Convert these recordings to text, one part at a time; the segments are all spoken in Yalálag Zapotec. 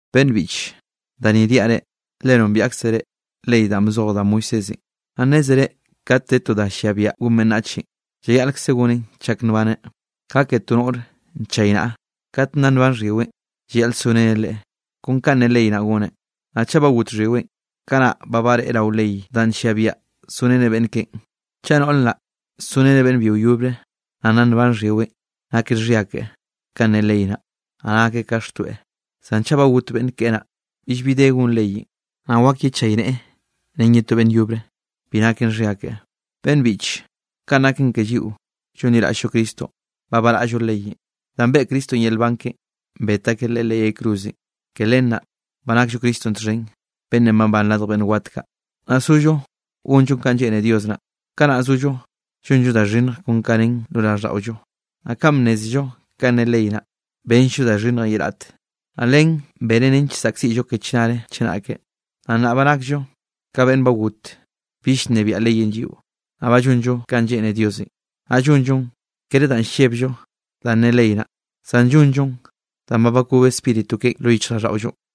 Beꞌnn biꞌche, da ni niaꞌ reꞌ, le nombiaꞌkzre ley danꞌ bzoj da Moisésenꞌ. Naꞌ nnézere kat de to da llia biaꞌa gon beꞌnnache, llayaꞌlkzeꞌ goneꞌn chak nbaneꞌ. Ka ke to noꞌr nchaynaꞌa, kat nna nban xhyiweꞌ, llayaꞌl soreneꞌ leꞌe, kon kanꞌ ne ley naꞌ goneꞌ. Naꞌ chaꞌ ba got xhyiweꞌn, kanaꞌ ba bareꞌe rao ley danꞌ nllia biaꞌa soreneꞌ beꞌnn keꞌen. Chaꞌ noꞌr naꞌ soreneꞌ beꞌnn byio yobre, naꞌ nna nban xhyiweꞌn, naken xhia keꞌe ka ne ley naꞌ, naꞌ nakeꞌ ka xtoeꞌ. Zan chaꞌ ba got beꞌnn keꞌe naꞌ, billbi de gon leyenꞌ, naꞌ wak yechayneꞌe ren ye to beꞌnn yobre, bi naken xhia keꞌe. Beꞌnn biꞌche, kaꞌn naken ke lliꞌo llonliraꞌll-llo Cristonꞌ ba baraꞌllo leyenꞌ, danꞌ beꞌe Cristonꞌ yel nban keꞌen bet akeꞌ Leꞌe leꞌ yay cruzenꞌ. Ke len naꞌ ba nakllo Cristonꞌ txhen, beꞌnnenꞌ babán radj beꞌnn wat kaꞌ, naꞌ sollo gonllo kanꞌ lleꞌne Dios naꞌ. Kanaꞌ nna zollo llonllo da xhinnj kon ka nen lo raꞌlldaꞌollo. Naꞌ kanꞌ bnnézello kanꞌ ne ley naꞌ, benll-llo da xhinnjenꞌ ye raꞌte, naꞌ len benen nench saꞌkziꞌllo ke chnare chenake. Naꞌ nnaꞌ ba nakllo ka beꞌnn ba got bill llnebiaꞌ leyenꞌ lliꞌo, naꞌ ba llonllo kanꞌ lleꞌne Diosenꞌ; naꞌ llonllon, kere danꞌ llebllo danꞌ ne ley naꞌ, zan llonllon danꞌ ba bakob Spíritu keꞌen lo yichjraꞌlldaꞌollonꞌ.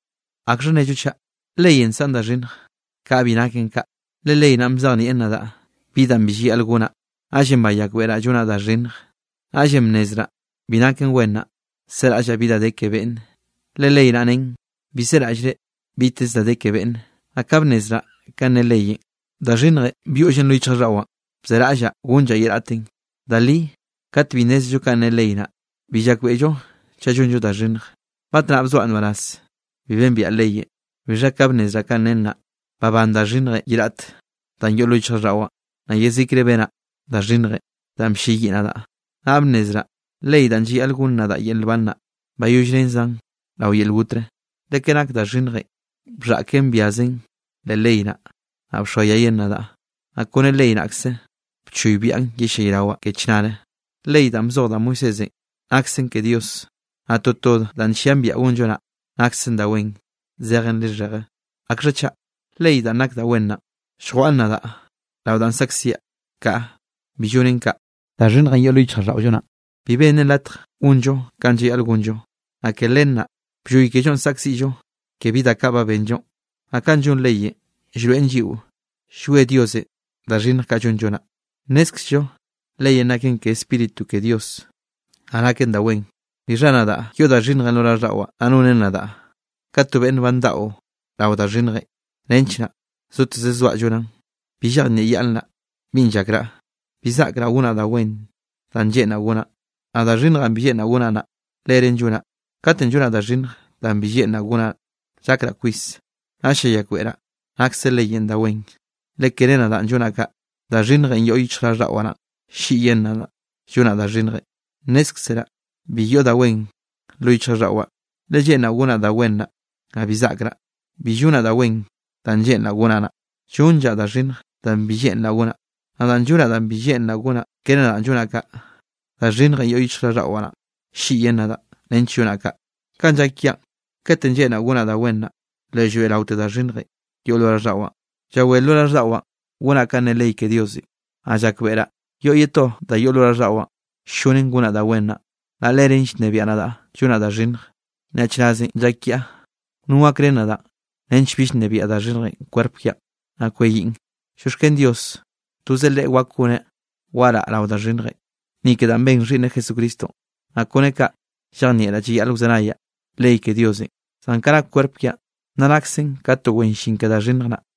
¿Akxha nnello chaꞌ? ¿Leyenꞌ nsaꞌn da xhinnj? Kaꞌa bi naken kaꞌ. Le ley naꞌn bzejnieꞌ nadaꞌ bi danꞌ bi llayaꞌl gonaꞌ, naꞌllenꞌ bayakbeꞌraꞌ llonaꞌ da xhinnj. Naꞌll bnnezraꞌ bi naken wen naꞌ, seraꞌllaꞌ bi da de ke beꞌnne, le ley naꞌ nen: “Bi seraꞌllre biteze da de ke beꞌnne.” Naꞌ ka bnnezraꞌ kanꞌ ne leyenꞌ, da xhinnjenꞌ byoꞌllen lo yichjraꞌlldaꞌwaꞌn, bzeraꞌllaꞌ gonllaꞌ ye raꞌtenꞌ. Da li kat bi nnézello kanꞌ ne ley naꞌ, bi llakbeꞌllo chaꞌ llonllo da xhinnj. Batnaꞌ bzoaꞌ nbaraz bi bembiaꞌ leyenꞌ. Bixha ka bnnezraꞌ ka nen naꞌ, babán da xhinnjenꞌ ye raꞌt danꞌ yoꞌ lo yichjraꞌlldaꞌwaꞌn, naꞌ yezikre benaꞌ da xhinnjenꞌ danꞌ blleyiꞌ nadaꞌ. Naꞌ bnnezraꞌ ley danꞌ llayaꞌl gonn nadaꞌ yel nban naꞌ, bayollrenzaꞌn rao yel gotre. Le ke nak da xhinnjenꞌ bxhaꞌken byazen leꞌ ley naꞌ, naꞌ bxoayayen nadaꞌ, naꞌ kone ley naꞌkze, bchoybiaꞌn yellayrawaꞌ ke chnare. Ley danꞌ bzoj da Moisésenꞌ naksen ke Dios, naꞌ toto danꞌ nllian biaꞌa gonllo naꞌ, naksen da wen zejen lixheje. ¿Akxha chaꞌ? ¿Ley danꞌ nak da wen naꞌn lljwaꞌn nadaꞌ rao danꞌ saꞌkziaꞌ? ¡Kaꞌa, bi llonen kaꞌ! Da xhinnjenꞌ yoꞌ lo yichjraꞌlldaꞌollo naꞌn, bi bennen latj gonllo kanꞌ llayaꞌl gonllo, naꞌ ke len naꞌ blloy kellonꞌ saꞌkziꞌllo ke bi da kaꞌ ba benllonꞌ. Naꞌ kanꞌ llon leyenꞌ llroeꞌn lliꞌo llwie Diosenꞌ da xhinnj kaꞌ llonllo naꞌ. Nnézkzello leyenꞌ naken ke Spíritu ke Dios, naꞌ naken da wen, bixha nadaꞌ yoꞌ da xhinnjenꞌ lo raꞌlldaꞌwaꞌ, naꞌ nonen nadaꞌ ka to beꞌnn ba ndaꞌo rao da xhinnjenꞌ, nench naꞌ zoteze zoaꞌ llonaꞌn. Bi llejnieꞌyaꞌnnraꞌ binꞌ llakraꞌ, bi zaꞌkraꞌ gonaꞌ da wen danꞌ lleꞌnraꞌ gonaꞌn, naꞌ da xhinnjenꞌ bi lleꞌnraꞌ gonaꞌ naꞌ, leren llonaꞌ. Katenꞌ llonaꞌ da xhinnj danꞌ bi lleꞌnraꞌ gonaꞌn, llakraꞌ kwis, naꞌll llayakbeꞌraꞌ nakse leyenꞌ da wen. Le kere nadaꞌn llonaꞌ kaꞌ, da xhinnjenꞌ yoꞌ yichjraꞌlldaꞌwaꞌ naꞌn, ll-lliꞌyen nadaꞌ llonaꞌ da xhinnjenꞌ. Nnézkzeraꞌ bi yoꞌ da wen lo yichjraꞌlldaꞌwaꞌ. Le lleꞌnraꞌ gonaꞌ da wen naꞌ, naꞌ bi zaꞌkraꞌ. Bi llonaꞌ da wen danꞌ lleꞌnraꞌ gonaꞌ naꞌ, llonllaꞌ da xhinnj danꞌ bi lleꞌnraꞌ gonaꞌ. Naꞌ danꞌ llonaꞌ danꞌ bi lleꞌnraꞌ gonaꞌn, kere nadaꞌn llonaꞌ kaꞌ, da xhinnjenꞌ yoꞌ yichjraꞌlldaꞌwaꞌ naꞌn, ll-lliꞌyen nadaꞌ nench llonaꞌ kaꞌ. Kanꞌ llak kiaꞌn: katenꞌ lleꞌnraꞌ gonaꞌ da wen naꞌ, le llroeꞌraote da xhinnjenꞌ yoꞌ lo raꞌlldaꞌwaꞌn. Llawé lo raꞌlldaꞌwaꞌ gonaꞌ kanꞌ ne ley ke Diosenꞌ. Naꞌ llakbeꞌraꞌ yoꞌ ye to da yoꞌ lo raꞌlldaꞌwaꞌ ll-llonen gonaꞌ da wen naꞌ, naꞌ leren llnebiaꞌ nadaꞌ llonaꞌ da xhinnj. ¡Nyaꞌchrazenꞌ llak kiaꞌ! ¿No gakrén nadaꞌ nench bill nnebiaꞌ da xhinnjenꞌ kwerp kiaꞌn, naꞌ kweyiꞌn? ¡Llioxken Dios! Toze Leꞌe wak goneꞌ waraꞌa rao da xhinnjenꞌ, ni ke danꞌ ben Xhiꞌnneꞌ Jesucristonꞌ. Naꞌ kone kaꞌ llejnieꞌraꞌ llayaꞌl wzenayaꞌ ley ke Diosenꞌ, zan ka nak kwerp kiaꞌn nna naksen ka to wen llin ke da xhinnj naꞌ.